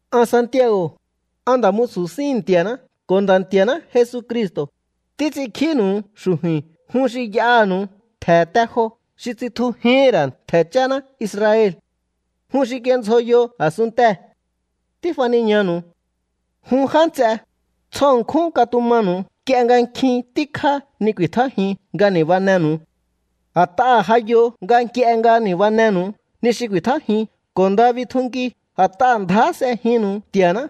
An Santiago̱, an nda̱ musu̱ síhi̱n Nti̱a̱ná ko̱ Nda̱ Nti̱a̱ná Jesucristo̱, títs'inkjínu̱u xu̱ju̱i̱n jun xi y'aha̱nu̱u ntje̱ te jo xi tsitjujíhi̱n ra̱ ntje̱ cháná Israel. Jun xi kindzjoyo a̱sunntee̱. Tífaniñanu̱u. Jun já nts'e, tsjo ṉkjún katumanu̱u nk'ie nga nkjin tíkjá ni ku̱i̱tjájiun nga ni̱banenu̱u. A̱t'aha̱ ja yo nga nk'ie nga ni̱banenu̱u ni xi ku̱i̱tjájiun ko̱ nda bitjunkiu a̱t'aha̱ ndjá s'ejinnu̱u Nti̱a̱ná,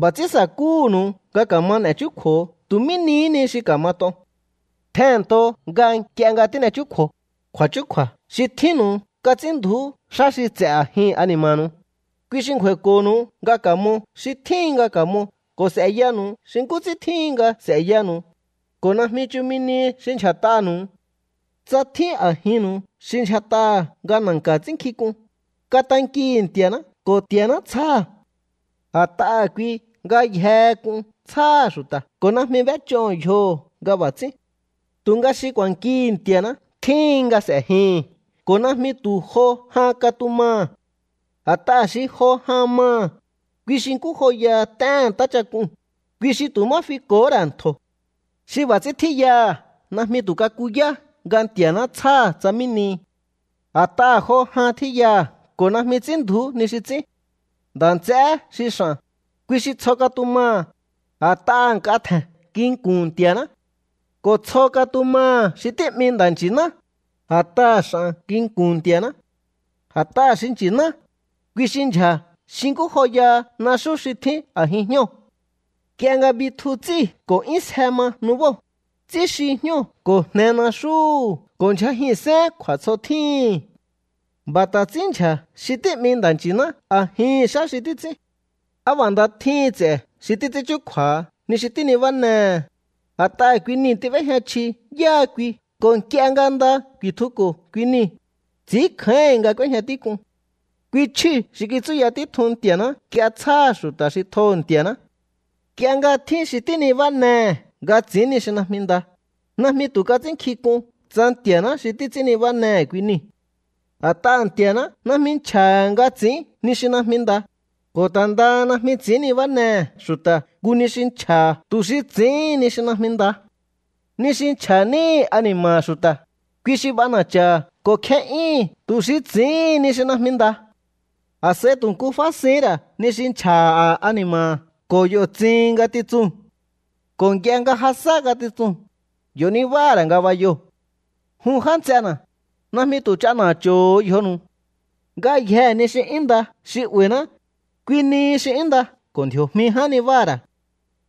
b'a̱ ts'ín sa̱kúhu̱nu̱u nga ka̱ma n'e̱ chúkju̱o tu̱ mí nihí ni xi ka̱mat'on. Tjehe̱nnto nga nk'ie nga tín'e chúkju̱o, kju̱a̱chúkju̱a̱ xi tjínnu̱u kats'ínndju̱ú xá xi ts'e̱ a̱jin ani̱ma̱nu̱u. Kui xi ngju̱a̱i̱ko̱nu̱u nga ka̱mo xi tjíhin nga ka̱mo ko̱ s'e̱yanu̱u xi nkú ts'ín tjíhin nga s'e̱yanu̱u, ko̱ najmi chumi nihi xi ndyja̱t'anu̱u. Tsa tjín a̱jinnu̱u xi ndyjat'aha̱ nga na̱nka̱ ts'ínkjink'un, katankihi̱ Nti̱a̱ná ko̱ Nti̱a̱ná tsjáha̱. A̱t'aha̱ kui ngayjehe k'un tsjáha̱ xu̱ta̱ ko̱ najmi b'éch'oho̱ yjoho̱ nga b'a̱ ts'ín. Tu̱nga xi ku̱a̱nkihi̱ Nti̱a̱ná tjíhín nga s'e̱jihi̱n ko̱ najmi tu̱ jo jan katumaha̱. A̱t'aha̱ xi jo jan maha̱, kui xi nkú joyaha t'éhe̱n ntáchak'uu̱n, kui xi tu̱ má fiko̱hó ra̱ ntjo̱. Xi b'a̱ ts'ín tjíyaha̱ najmi tu̱ kakuyá nga Nti̱a̱ná tsjáha̱ tsa mí nihi. A̱t'aha̱ jo jan tjíyaha̱ ko̱ najmi ts'ínndju̱ú ni xi ts'ín. Nda̱ nts'eé xi x'a̱n, kui xi tsjo katumaha̱, a̱t'aha̱ nk'a tje̱n nginku̱n Nti̱a̱ná. Ko̱ tsjo katumaha̱ xi tí'mi nda̱nchi̱ná, a̱t'aha̱ x'a̱n nginku̱n Nti̱a̱ná. A̱t'aha̱ xi nchi̱ná, kui xi ndyja̱ xi nkú joyaha naxú xi tjín a̱jin jñóo̱. Nk'ie nga bitju ts'íu̱ ko̱ 'yún sje ma nubóo̱, ts'ínxi jñóo̱ ko̱ jne naxúhu̱ ko̱ ndyjajihi̱nsén kju̱a̱tsjotjíhi̱n. B'a̱ ta̱ ts'ínndyja̱ xi tí'mi nda̱nchi̱ná a̱jihi̱n xá xi títs'ín. Á b'a̱ nda tjíhin ts'e̱ xi títs'ín chúkju̱a̱ha ni xi tínibán'ehe̱, a̱t'aha̱ kui niu̱ tíb'éjña chji yáha kui ko̱ nk'ie nga nda ku̱i̱tjuko̱ kui niu̱, ts'i̱ínkjáíhi̱n nga k'úéjña tík'un. Kui chjíu̱ xi kitsúya títjun Nti̱a̱ná nga tsjáha̱ xu̱ta̱ xi tjoho̱ Nti̱a̱ná. Nk'ie nga tjín xi tínibánehe̱ nga ts'i̱ín ni xi najmi nda, najmi tu̱ kats'ínnkjink'un tsa Nti̱a̱ná xi títs'ín nibánehe̱ kui niu̱. A̱t'aha̱ Nti̱a̱ná najmi nchja̱ha̱ nga ts'i̱ín ni xi najmi nda, ko̱ ta̱ ndaha najmi ts'i̱ín nibánehe̱ xu̱ta̱ nku ni xi nchja̱ha̱ tu̱ xi ts'i̱íhin ni xi najmi nda. Ni xi nchja̱ níhi̱ a̱ni̱ma̱ha̱ xu̱ta̱, kui xi b'ana̱cha̱ha̱ ko̱ kje'yúhu̱n tu̱ xi ts'i̱íhin ni xi najmi nda. A̱s'a̱i tu̱ nku fásihín ra̱ ni xi nchja̱ha̱ ani̱ma̱ha̱ ko̱ yo̱ tsihin ngatitsuu̱n. Ko̱ nk'ie nga ja sá ngatitsuu̱n, yo̱ nibáha̱ ra̱ ngabayoo̱. Jun já nts'ena̱, najmi tu̱ ch'ana̱cho̱ho̱ yjonu̱u. Ngayjee̱ ni xi 'yún nda xi 'ba̱i̱ná, kui nihi xi 'yún nda ko̱ ndji̱o̱jmi ján nibáha̱ ra̱.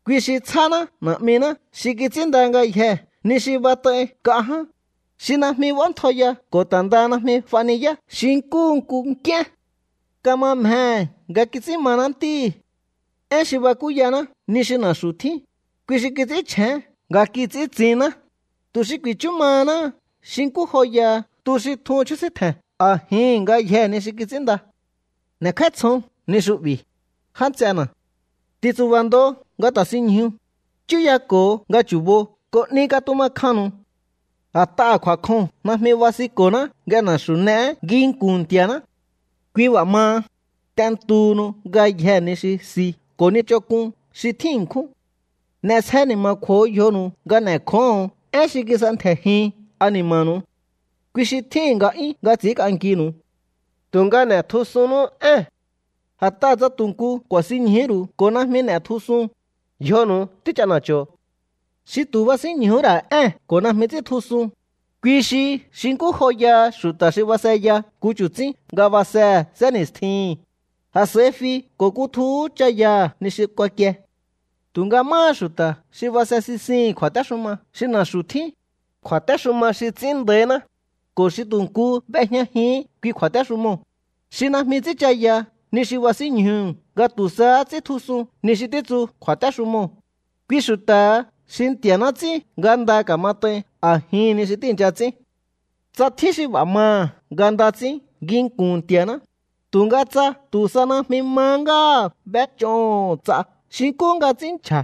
Kui xi tsjáná Na̱'miná xi kits'ínnda ngayjee̱ ni xi bat'ai nk'a ján, xi najmi b'óntjaiya ko̱ ta̱ ndaha najmi f'ajniyá xi nkúhu nku nk'íén. Kama mjehe̱ nga kits'ín maná ntíhi̱. Én xi bakúyaná ni xi na̱xu̱ tjín, kui xi kits'ínchjén nga kits'íntsinná, tu̱ xi ku̱i̱chu mahaná xi nkú joyaha tu xi tjun chjúsítje̱n a̱jihi̱n ngayjee̱ ni xi kits'ínnda. N'e̱kj'áítsjon ni xu'bi̱, já nts'ena̱. Ti̱ntsu̱ba̱ ndo nga ta̱sinñju, chúyako̱o nga chu̱bo ko̱ 'ni katuma kjannu̱u. A̱t'aha̱ kju̱a̱kjoo̱n najmi basinko̱ná nga na̱xu̱ n'eé nginku̱n Nti̱a̱ná. Kui b'a̱ maha, t'entuhunu ngayjee̱ ni xi si ko̱ ni ch'onk'un xi tjín ṉkjún. N'e̱sje ni̱ma̱kju̱o yjonu̱u nga n'e̱kjóho̱on én xi kis'entje̱jin ani̱ma̱nu̱u. Kui xi tjíhi̱n nga'yún nga ts'i̱ínk'ankinu̱u. Tu̱nga n'e̱tjusunnú ée̱n. A̱t'aha̱ tsa tu̱ nku ku̱a̱sinñjuhú ru̱u ko̱ najmi n'e̱tjusun, yjonu̱u tích'ana̱cho̱. Xi tu̱ basínñjuhú ra̱ ée̱n ko̱ najmi ts'íntjusun, kui xi xi nkú joyaha xu̱ta̱ xi baseya nku chu̱tsín nga basehe̱ sénni̱stjihi̱n, a̱s'a̱i fi ko̱ kutjuhú cha̱yaha̱ ni xi kuakie. Tu̱nga máha xu̱ta̱ xi base sisihi̱n kju̱a̱téxuma xi na̱xu̱ tjín, kju̱a̱téxuma xi ts'ín nda̱íná, ko̱ xi tu̱ nku b'ejñajihín kui kju̱a̱téxumoo̱, xi najmi ts'ínchaya ni xi basínñjuhu̱ nga tu̱ sahá ts'íntjusun ni xi títsu kju̱a̱téxumoo̱, kui xu̱ta̱ha xi Nti̱a̱ná ts'ín nga nda ka̱mat'ain a̱jihi̱n ni xi tíi̱ncha ts'ín. Tsa tjín xi b'a̱ maha̱ nga nda ts'ín nginku̱n Nti̱a̱ná, tu̱nga tsa tu̱ sa najmi mahá ngáha̱ b'éch'oho̱ ts'a xi nkú nga ts'ín nchja̱,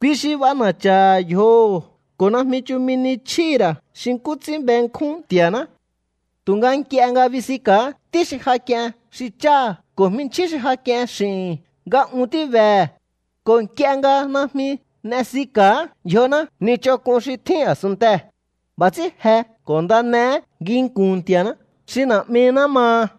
kui xi b'ana̱cha̱ha̱ yjoho̱ ko̱ najmi chumi ni chjíhi̱ ra̱ xi nkú ts'ín benkjún Nti̱a̱ná. Tu̱nga nk'ie nga bisinka̱á ntí xi ja k'ien xi cháha̱ ko̱ jminchjín xi ja k'ien x'i̱hi̱n nga un tíbehe̱, ko̱ nk'ie nga najmi n'esika̱á yjoná ni ch'onk'un xi tjín a̱sunntee̱, b'a̱ ts'ín je ko̱ nda n'eé nginku̱n Nti̱a̱ná xi Na̱'miná maha.